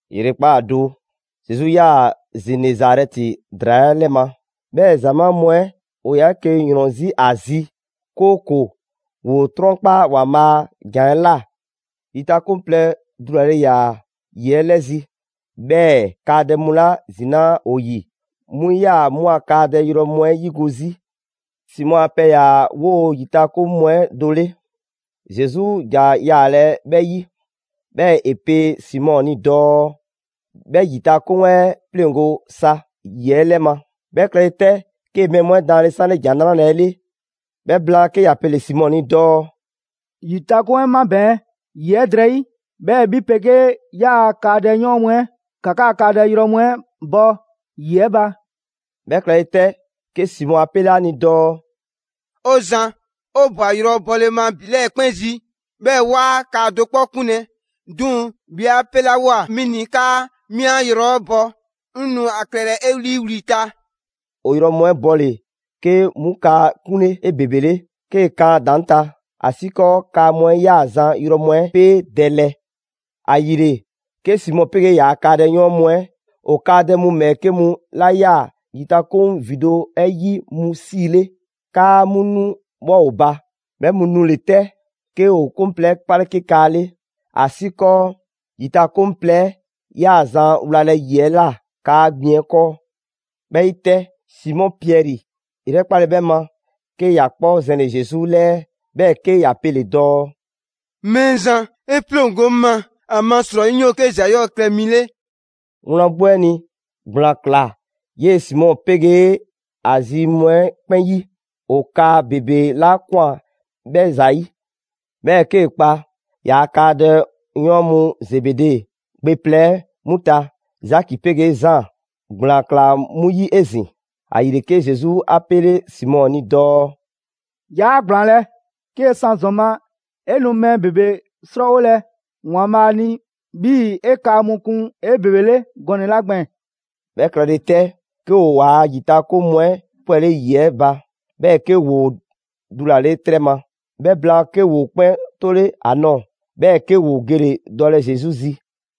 ‑Yrekpaa' do, Zesu 'yaa‑ Zenezarɛti ‑draa 'ɛ 'lɛ ma, 'bhɛɛ‑ ‑zamaa' mu 'ɛ ‑o ‑yaa 'eke‑ ‑yrɔn 'zi ‑a zi, 'kooko‑ ‑woo 'trɔnkpa ‑Waanbhaa' a ‑jan 'ɛ ꞊la. ‑Yitakoŋ plɛ dulale ‑yaa ‑yi 'ɛ 'lɛzi‑, 'bhɛɛ‑ kaadɛ mu 'la zinaa' ‑o ‑yi 'mu 'yaa‑ 'mu a kaadɛ yrɔ mu 'ɛ 'yigo‑ 'zi. Simɔ a pɛ ‑yaa 'woo‑ ‑yitakoŋ mu 'ɛ do 'le, Zesu ‑ja yaalɛ 'bhɛ 'yi. 'Bhɛɛ‑ ‑e pe Simɔ ni dɔɔ 'bhɛ ‑yitakoŋ 'ɛ 'pleŋgo sa ‑yi 'ɛ 'lɛ ma. 'Bhɛ klɛle 'tɛ, 'kee‑ mɛɛ mu 'ɛ daanle 'sanle ‑Jan 'Nrale‑ 'ɛ 'le. 'Bhɛ blaan 'ke ‑ya pele‑ Simɔ ni dɔɔ: «‑Yitakoŋ 'ɛ 'mabɛɛn‑ ‑yi 'ɛ drɛyi', 'bhɛɛ‑ 'bhi 'pegee 'yaa‑ kaadɛyɔɔn mu 'ɛ, ‑ka 'kaa‑ kaadɛ yrɔ mu 'ɛ bɔ ‑yi 'ɛ ba.» 'Bhɛ klɛle 'tɛ, 'ke Simɔ 'a 'pele ‑a ni dɔɔ: «'O Zan, 'o ꞊bwa yrɔ bɔle ma ‑bi 'lɛɛ‑ 'kpɛn zi, 'bhɛɛ‑ 'waa kaa do 'kpɔ 'kunlɛ‑. 'Duŋ‑ 'bhi 'a 'pelawoa 'mi ni 'kaa 'mi 'an yrɔ 'ɛ bɔ, 'ŋ nu a klɛlɛ 'e 'liiwli‑ ta.» ‑O yrɔ mu 'ɛ bɔle, 'kee‑ 'mu kaa 'kunle 'ebebele 'kee‑ kan ‑a ‑daŋ' ta, ‑asiikɔɔ kaa mu 'ɛ 'yaa‑ zan yrɔ mu 'ɛ 'peedɛlɛ. ‑Ayile, 'ke Simɔ 'pegee ‑yaa' kaadɛyɔɔn mu 'ɛ ‑o kaadɛ mu ‑bhɛɛke' mu 'la 'yaa‑ ‑yitakoŋ ‑vindo' 'ɛ 'yi 'mu 'siile, 'kaa 'mu 'nu 'bhɔ ‑o ba. 'Bhɛ mu nule 'tɛ 'ke ‑o 'koŋ plɛ 'ɛ 'pale 'ke kaa 'le ‑asiikɔɔ ‑yitakoŋ plɛ 'ɛ 'yaa‑ zan wlalɛ ‑yi 'ɛ ꞊la kaa gbiŋ 'ɛ 'kɔɔ. 'Bhɛ 'yi 'tɛ, Simɔ Piɛri 'yrɛkpale 'bhɛ ma, 'ke ‑ya 'kpɔ zɛnle‑ Zesu 'lɛɛ, 'bhɛɛ‑ 'ke ‑ya pele‑ dɔɔ: «Mɛɛzan, 'e 'pleŋgo 'ŋ ma, ‑amasrɔyi 'ŋ 'yoo‑ 'ke ‑za 'yɔɔ‑ klɛ mi 'le.» Wlan 'gbu 'ɛ ni, ‑gblaan ꞊klaa 'yee‑ Simɔ 'pegee ‑a zi mu 'ɛ 'kpɛn 'yi, ‑o kaa ‑bebe 'la ꞊kwan 'bhɛ ‑zayi'. 'Bhɛɛ‑ 'kee‑ kpa ‑yaa' kaadɛyɔɔn mu Zebede gbe plɛ 'ɛ 'mu ta, Zaki 'pegee Zaan, ‑gblaan ꞊klaa 'mu 'yi 'ezin‑. ‑Ayile, 'ke Zesu 'a 'pele Simɔ ni dɔɔ: «'Yaa ‑gblaanlɛ', 'kee‑ san ‑zɔn ma, 'e nu mɛɛ ‑bebe 'srɔɔwolɛ ‑Waanbhaa' ni 'bhii‑ 'e kaa mu kun 'ebebele gɔnɛ‑ 'la gbɛɛn‑.» 'Bhɛ klɛle 'tɛ, 'ke ‑o ‑waa' ‑yitakoŋ mu 'ɛ 'pwɛle ‑yi 'ɛ ba, 'bhɛɛ‑ 'ke ‑woo dulale 'trɛ ma. 'Bhɛ blaan, 'ke ‑woo 'kpɛn 'tole ‑a nɔɔ‑, 'bhɛɛ‑ 'ke ‑o gele‑ dɔlɛ Zesu zi.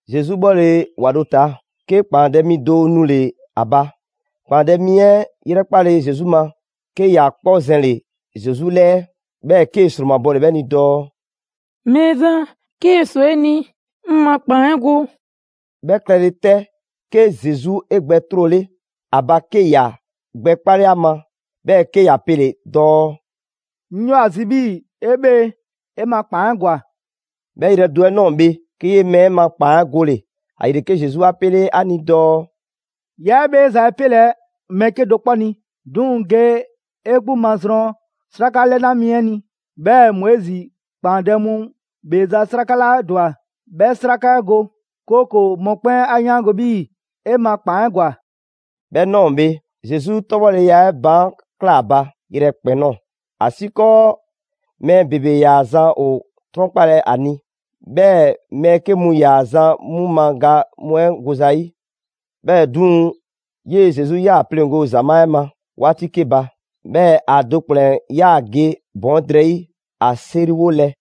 Zesu 'bhɔle‑ ‑wa do ta, 'ke ‑kpaandɛ' mi do nule‑ ‑a ba. ‑Kpaandɛ' mi 'ɛ 'yrɛkpale Zesu ma, 'ke ‑ya 'kpɔ zɛnle‑ Zesu 'lɛɛ, 'bhɛɛ‑ 'kee‑ ‑sromabɔle 'bhɛ ni dɔɔ: «Mɛɛzan, 'kee‑ ꞊swa 'e ni, 'ŋ ma ‑kpaan 'ɛ go.» 'Bhɛ klɛle 'tɛ, 'ke Zesu 'e gbɛ 'trole ‑a ba, 'ke 'ya gbɛkpale ‑a ma, 'bhɛɛ‑ 'ke ‑ya pele‑ dɔɔ: «'Ŋ 'yoo‑ ‑a zi 'bhii‑ 'e 'bhee‑, 'e ma ‑kpaan 'ɛ ‑gwa!» 'Bhɛ yrɛ do 'ɛ ꞊nɔɔ bhe, 'ke 'yee‑ mɛɛ 'ɛ ma ‑kpaan 'ɛ gole‑. ‑Ayile, 'ke Zesu 'a 'pele ‑a ni dɔɔ: «'Yaa 'e 'bheeza‑ 'ɛ 'pelɛ‑ mɛɛ 'kedo‑ 'kpɔ ni. 'Duŋ‑ ge 'e 'gbu mazrɔn 'sraka 'lɛna mi 'ɛ ni. 'Bhɛɛ‑ Moizi ‑kpaandɛ' mu ‑bheeza' 'sraka 'la ‑dwa 'bhɛ 'sraka 'ɛ go, 'kooko‑ mɔkpɛn' 'a 'yaango‑ 'bhii‑ 'e ma ‑kpaan 'ɛ ‑gwa.» 'Bhɛ ꞊nɔɔ bhe, Zesu 'tɔbhɔleya 'ɛ baan' ꞊klaa ba yrɛkpɛn‑ ꞊nɔɔ, ‑asiikɔɔ mɛɛ ‑bebe 'yaa‑ zan ‑o 'trɔnkpalɛ ‑a ni. 'Bhɛɛ‑ mɛɛ 'ke mu ‑yaa zan 'mu ma ga mu 'ɛ goza 'yi. 'Bhɛɛ‑ 'duŋ‑, 'yee‑ Zesu 'yaa‑ 'pleŋgo‑ ‑zamaa' 'ɛ ma 'waati 'ke ba. 'Bhɛɛ‑ ‑a do ‑kplɛn 'yaa‑ ge ‑bɔn 'ɛ drɛyi' ‑a 'seriwolɛ.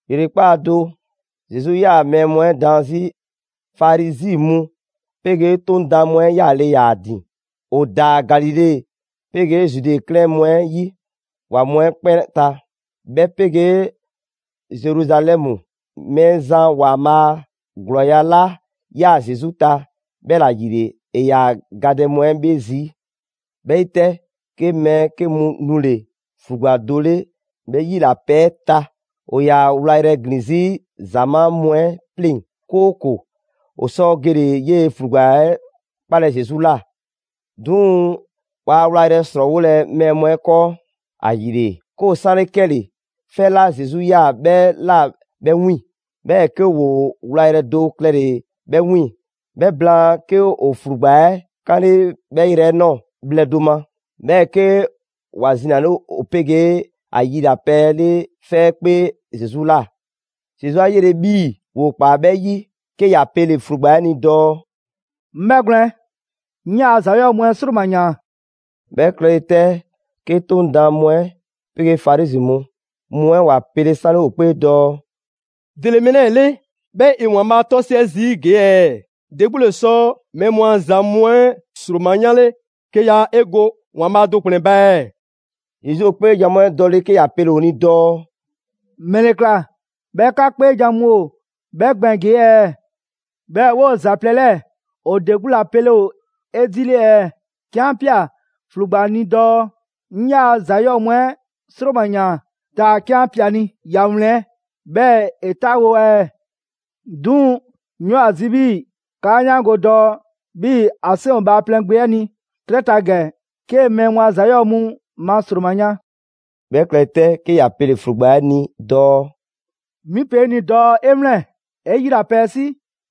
‑Yrekpaa' do, Zesu 'yaa‑ mɛɛ 'ɛ mu daan 'zi. Farizi mu 'pegee 'Toŋ daan mu 'ɛ 'yaale‑ ‑yaa ‑a ‑din. ‑O ‑daa Galile 'pegee Zude 'klɛɛn mu 'ɛ ‑yi ‑wa mu 'ɛ 'kpɛn ta, 'bhɛ 'pegee Zeruzalɛmu. Mɛɛzan ‑Waanbhaa' a ‑glɔɔya' 'la 'yaa‑ Zesu ta, 'bhɛla‑ ‑yile ‑e ‑yaa gadɛ mu 'ɛ ‑bhee 'zi. 'Bhɛ 'yi 'tɛ, 'ke mɛɛ 'ke mu nule‑ ‑flugba do 'le 'bhɛ 'yilapɛ 'ɛ ta. ‑O ‑yaa wlayrɛ ‑glin 'zi ‑zamaa' mu 'ɛ 'pleŋ‑, 'kooko‑ ‑o sɔ gele‑ 'yee‑ ‑flugba 'ɛ 'kpaalɛ‑ Zesu ꞊la. 'Duŋ‑ waa wlayrɛ ‑srɔɔwolɛ mɛɛ mu 'ɛ 'kɔɔ. ‑Ayile, 'ke ‑o 'sanle 'kɛle‑ 'fɛ 'la Zesu 'yaa‑ 'bhɛ ꞊la 'bhɛ 'wiiŋ‑. 'Bhɛɛ‑ 'ke ‑woo wlayrɛ do klɛle‑ 'bhɛ 'wiiŋ‑. 'Bhɛ blaan 'ke ‑o ‑flugba 'ɛ 'kanle 'bhɛ yrɛ 'ɛ ꞊nɔɔ bhlɛ do ma, 'bhɛɛ‑ 'ke ‑wa zinale ‑o 'pegee ‑a yilapɛ 'ɛ 'le 'fɛ 'ɛ 'kpee Zesu ꞊la. Zesu 'a 'yele‑ 'bhii‑ ‑woo ‑kpaa 'bhɛ 'yi, 'ke ‑ya pele‑ ‑flugba 'ɛ ni dɔɔ: «'Ŋ 'bhɛgwlɛn‑, 'ŋ 'yaa‑ ‑za 'yɔɔ‑ mu 'ɛ 'sroma‑ ‑yaan.» 'Bhɛ klɛle 'tɛ, 'ke 'Toŋ daan mu 'ɛ 'pegee Farizi mu mu 'ɛ ‑wa pele 'sanle ‑o 'kpee dɔɔ: «‑Dele mɛɛ 'lɛɛ‑ 'le, 'bhɛɛ‑ ‑e ‑Waanbhaa' 'tɔsiɛ zii' ‑gee' ɛɛ? ‑De 'gbu ‑le sɔ mɛɛ mu a ‑za mu 'ɛ ‑sroma 'yanle 'ke yaa 'e go ‑Waanbhaa' do ‑kplɛn ba ɛɛ?» Zesu ‑o 'kpeejan‑ mu 'ɛ dɔle 'ke ‑ya pele‑ ‑o ni dɔɔ: «‑Mɛle ‑kla 'bhɛɛ‑ 'ka 'kpeejan‑ mu ‑o 'bhɛ gbɛɛn‑ ‑gee' ɛɛ?» 'Bhɛɛ‑ 'woo‑ ‑za plɛ 'lɛɛ‑ ‑o ‑de 'gbu ‑la pele ‑o 'edile ɛɛ? 'Ke 'an ꞊pia ‑flugba ni dɔɔ: «'Ŋ 'yaa‑ ‑za 'yɔɔ‑ mu 'ɛ 'sroma‑ ꞊yaan, taa‑ 'ke 'an ꞊pia ‑a ni ‑ya wlɛn 'bhɛɛ‑ ‑e 'taawo ɛɛ? 'Duŋ‑ 'ŋ 'yoo‑ ‑a zi 'bhii‑ 'kaa 'yaango‑ dɔɔ 'bhii‑ ‑a 'seŋ ‑o Bhaaplɛŋ Gbe 'ɛ ni 'trɛ ta ‑gɛ 'kee‑ mɛɛ mu a ‑za 'yɔɔ‑ mu ma ‑sroma yan.» 'Bhɛ klɛle 'tɛ, 'ke ‑ya pele‑ ‑flugba 'ɛ ni dɔɔ: «'Mi pe 'e ni dɔɔ 'e 'wlɛn‑, 'e 'yilapɛ 'ɛ 'si,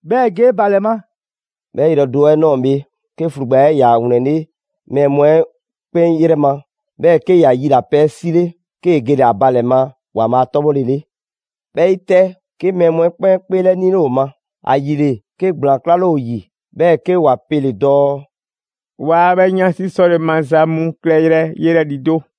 'bhɛɛ‑ ge 'e ba ‑lɛ ma.» 'Bhɛ yrɛ do 'ɛ ꞊nɔɔ bhe, 'ke ‑flugba 'ɛ ‑ya ‑wlɛnle' mɛɛ mu 'ɛ 'kpɛn 'yrɛ ma, 'bhɛɛ‑ 'ke ‑ya yilapɛ 'ɛ 'sile, 'kee‑ gele‑ ‑a ba ‑lɛ ma ‑Waanbhaa' 'tɔbhɔlele. 'Bhɛ 'yi 'tɛ, 'ke mɛɛ mu 'ɛ 'kpɛn 'kpeelɛnile ‑o ma. ‑Ayile, 'ke ‑gblaan 'klale ‑o ‑yi, 'bhɛɛ‑ 'ke ‑wa pele‑ dɔɔ: «'Waa 'bhɛ 'yansi 'sɔle‑ maza mu klɛyrɛ yelɛ ‑lido'.»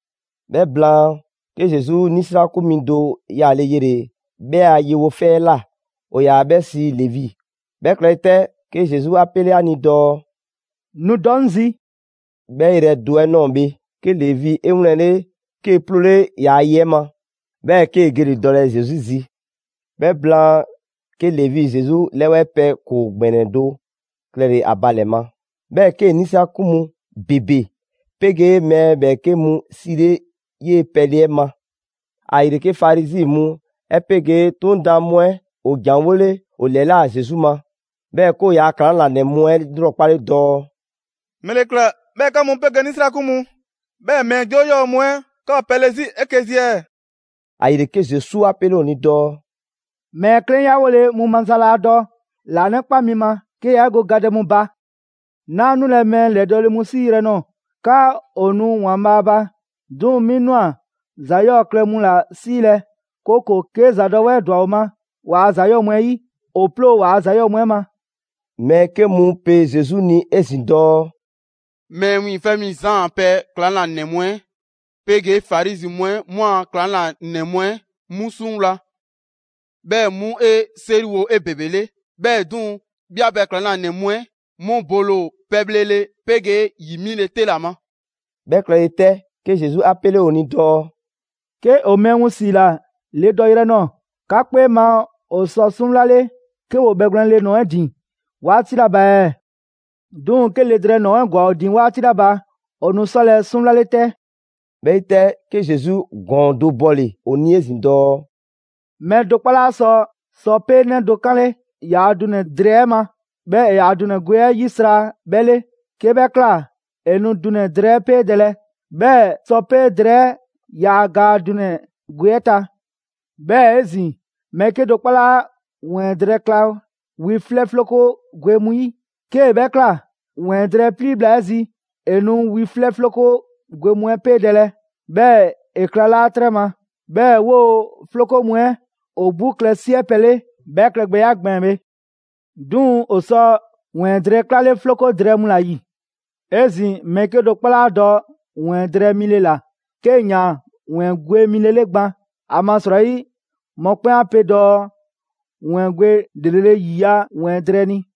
'Bhɛ blaan, 'ke Zesu 'nisrakun mi do yaale yele‑ 'bhɛ a yewo 'fɛ 'ɛ ꞊la. ‑O ‑yaa 'bhɛ sii Levi. 'Bhɛ klɛle 'tɛ, 'ke Zesu 'a 'pele ‑a ni dɔɔ: «Nu dɔ 'ŋ zi!» 'Bhɛ yrɛ do 'ɛ ꞊nɔɔ bhe, 'ke Levi 'e 'wlɛnle, 'kee‑ 'ploole ‑yaa' ye 'ɛ ma; 'bhɛɛ‑ 'kee‑ gele‑ dɔlɛ Zesu zi. 'Bhɛ blaan, 'ke Levi Zesu 'lɛwɛɛ pɛ ‑koo ‑gbɛnɛ do klɛle‑ ‑a ba ‑lɛ ma. 'Bhɛɛ‑ 'kee‑ 'nisrakun mu ‑bebe 'pegee mɛɛ ‑bhɛɛke' mu 'siile 'yee‑ pɛle 'ɛ ma. ‑Ayile, 'ke Farizi mu 'ɛ 'pegee 'Toŋ daan mu 'ɛ ‑o ‑janwole ‑o ‑lɛla' Zesu ma, 'bhɛɛ‑ 'ke ‑o yaa ‑klaŋlanɛ mu 'ɛ 'lrɔkpale dɔɔ: «‑Mɛle ꞊kla 'bhɛɛ‑ 'ka mu 'pegee 'nisrakun mu, 'bhɛɛ‑ mɛɛ 'joo 'yɔɔ‑ mu 'ɛ 'ka ‑o pɛle 'zi 'eke‑ zi ɛɛ?» ‑Ayile, 'ke Zesu 'a 'pele ‑o ni dɔɔ: «Mɛɛ 'klɛnyawole mu maza laa dɔ ‑laanɛkpa mi ma 'ke yaa 'e go gadɛ mu ba. 'Naa 'nule‑ mɛɛ ‑lɛdɔɔle mu 'siiyrɛ‑ ꞊nɔɔ 'kaa ‑o nu ‑Waanbhaa' ba, 'duŋ‑ 'mi ꞊nwa ‑za 'yɔɔ‑ klɛ mu ‑la 'siilɛ‑, 'kooko‑ 'ke ‑zadɔwɛɛ ꞊dwa ‑o ma waa ‑za 'yɔɔ‑ mu 'ɛ 'yi, ‑o ploo waa ‑za 'yɔɔ‑ mu 'ɛ ma.» Mɛɛ 'ke mu pe Zesu ni 'ezin‑ dɔɔ: «Mɛɛ Wiiŋfɛ' Mi Zaan a pɛ ‑klaŋlanɛ mu 'ɛ 'pegee Farizi mu 'ɛ 'mu a ‑klaŋlanɛ mu 'ɛ 'mu 'suŋwla‑, 'bhɛɛ‑ 'mu 'e 'seriwo 'ebebele, 'bhɛɛ‑ 'duŋ‑ 'bhi a pɛ ‑klaŋlanɛ mu 'ɛ 'mu bole ‑o pɛbhlele 'pegee ‑yi 'bhile‑ 'te ‑la ma.» 'Bhɛ klɛle 'tɛ, 'ke Zesu 'a 'pele ‑o ni dɔɔ: «'Ke ‑o mɛɛ mu ‑siila le do dɔyrɛ ꞊nɔɔ, 'ka 'kpee ma ‑o sɔ 'suŋwlale 'ke ‑woo ‑o bhɛgwlɛn le ‑nɔɔ 'ɛ ‑din 'waati 'la ba ɛɛ? 'Duŋ‑ 'ke le drɛɛ ‑nɔɔ 'ɛ ‑gwa ‑o ‑din 'waati 'la ba, ‑o nu 'sɔlɛ‑ 'suŋwlale 'tɛ.» 'Bhɛ 'yi 'tɛ, 'ke Zesu ‑gɔɔn do bɔle‑ ‑o ni 'ezin‑ dɔɔ: «Mɛɛ do 'kpɔ laa sɔ sɔpee' 'nɛ do 'kanle ‑yaa' dunɛ‑ drɛɛ 'ɛ ma, 'bhɛɛ‑ ‑e yaa ‑dunɛ gwe 'ɛ 'yisra‑ 'bhɛ 'le. 'Kee‑ 'bhɛ ꞊kla, ‑e nu dunɛ‑ drɛɛ 'ɛ 'peedɛlɛ, 'bhɛɛ‑ sɔpee' drɛɛ 'ɛ yaa gaa dunɛ‑ gwe 'ɛ ta. 'Bhɛɛ‑ 'ezin‑, mɛɛ 'kedo‑ 'kpɔ 'laa ‑wɛɛn drɛɛ kla wi 'flɛ 'floko gwe mu 'yi. 'Kee‑ 'bhɛ ꞊kla, ‑wɛɛn drɛɛ 'ɛ 'plii bhla 'ɛ zi, ‑e nu wi 'flɛ 'floko gwe mu 'ɛ 'peedɛlɛ, 'bhɛɛ‑ ‑e klalaa' 'trɛ ma, 'bhɛɛ‑ 'woo‑ 'floko mu 'ɛ ‑o 'gbu klɛ 'siɛ pɛ 'le 'bhɛ klɛgbɛya 'ɛ gbɛɛn‑ bhe. 'Duŋ‑ ‑o sɔ ‑wɛɛn drɛɛ 'klale 'floko drɛɛ mu ‑la ‑yi. 'Ezin‑, mɛɛ 'kedo‑ 'kpɔ 'laa dɔ ‑wɛɛn drɛɛ mile ‑la 'kee‑ ‑yaan ‑wɛɛn gwe mile 'le gban. ‑Amasrɔyi mɔkpɛn' 'a pe dɔɔ: ‹‑Wɛɛn gwe ‑lrele' ‑yiya' ‑wɛɛn drɛɛ ni.›»